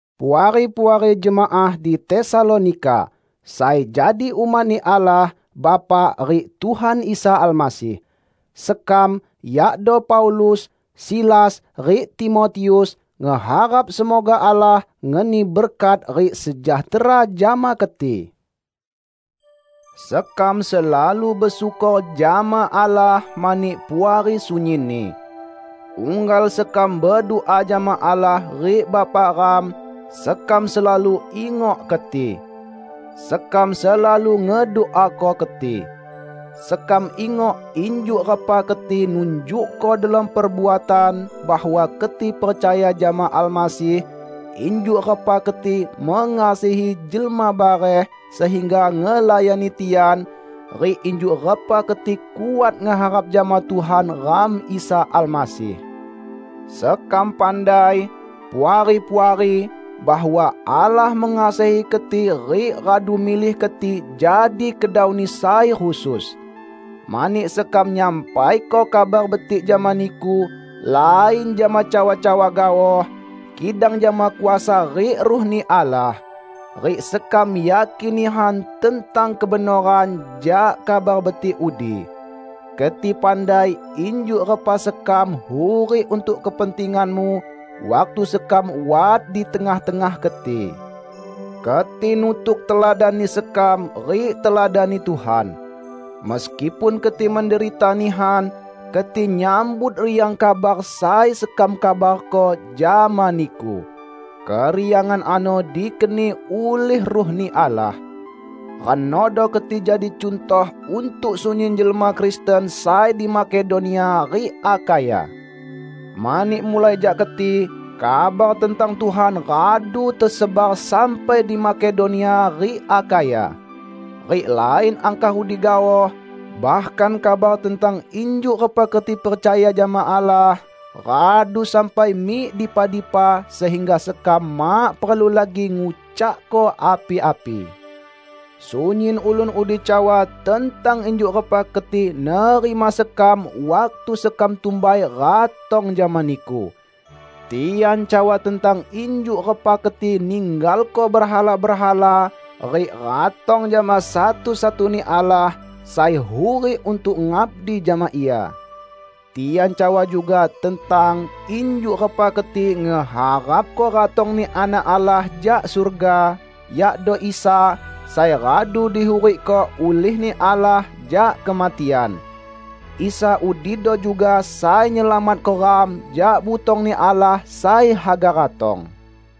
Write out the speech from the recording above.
Puari-puari jemaah di Tesalonika, sai jadi umat-Ni Allah Bapa rik Tuhan Isa Almasih: Sekam, yakdo Paulus, Silas rik Timotius ngeharap semoga Allah ngeni berkat rik sejahtera jama keti. Sekam selalu besyukor jama Allah mani Puari sunyinni. Unggal sekam bedua jama Allah rik Bapa ram, sekam selalu ingok keti. Sekam selalu ngeduako keti. Sekam ingok injuk repa keti nunjukko delom perbuatan bahwa keti percaya jama Almasih, injuk repa keti mengasihi jelma bareh sehingga ngelayani tian, rik injuk repa keti kuat ngeharap jama Tuhan ram Isa Almasih. Sekam pandai, Puari-puari, bahwa Allah mengasihi keti rik radu milih keti jadi kedau-Ni sai khusus. Mani sekam nyampaiko Kabar Betik jama niku lain jama cawa-cawa gaoh, kidang jama kuasa rik Ruh-Ni Allah. Rik sekam yakin nihan tentang kebenoran jak Kabar Betik udi. Keti pandai injuk repa sekam hurik untuk kepentinganmu waktu sekam wat di tengah-tengah keti. Keti nutuk teladanni sekam rik teladan-Ni Tuhan. Meskipun keti menderita nihan, keti nyambut riang kabar sai sekam kabarko jama niku. Keriangan ano dikeni ulih Ruh-Ni Allah. Renodo keti jadi cuntoh untuk sunyin jelma Kristen sai di Makedonia rik Akhaya. Mani mulai jak keti, kabar tentang Tuhan radu tesebar sampai di Makedonia rik Akhaya. Rik lain angkah udi gaoh; bahkan kabar tentang injuk repa keti percaya jama Allah radu sampai mik dipa-dipa sehingga sekam mak perlu lagi ngucakko api-api. Sunyin ulun udi cawa tentang injuk repa keti nerima sekam waktu sekam tumbai ratong jama niku. Tian cawa tentang injuk repa keti ninggalko berhala-berhala rik ratong jama satu-satuni Allah sai hurik untuk ngabdi jama Ia. Tian cawa juga tentang injuk repa keti ngeharapko ratong-Ni Anak Allah jak surga, yakdo Isa, sai radu dihurikko ulih-Ni Allah jak kematian. Isa udido juga sai nyelamatko ram jak butong-Ni Allah sai haga ratong.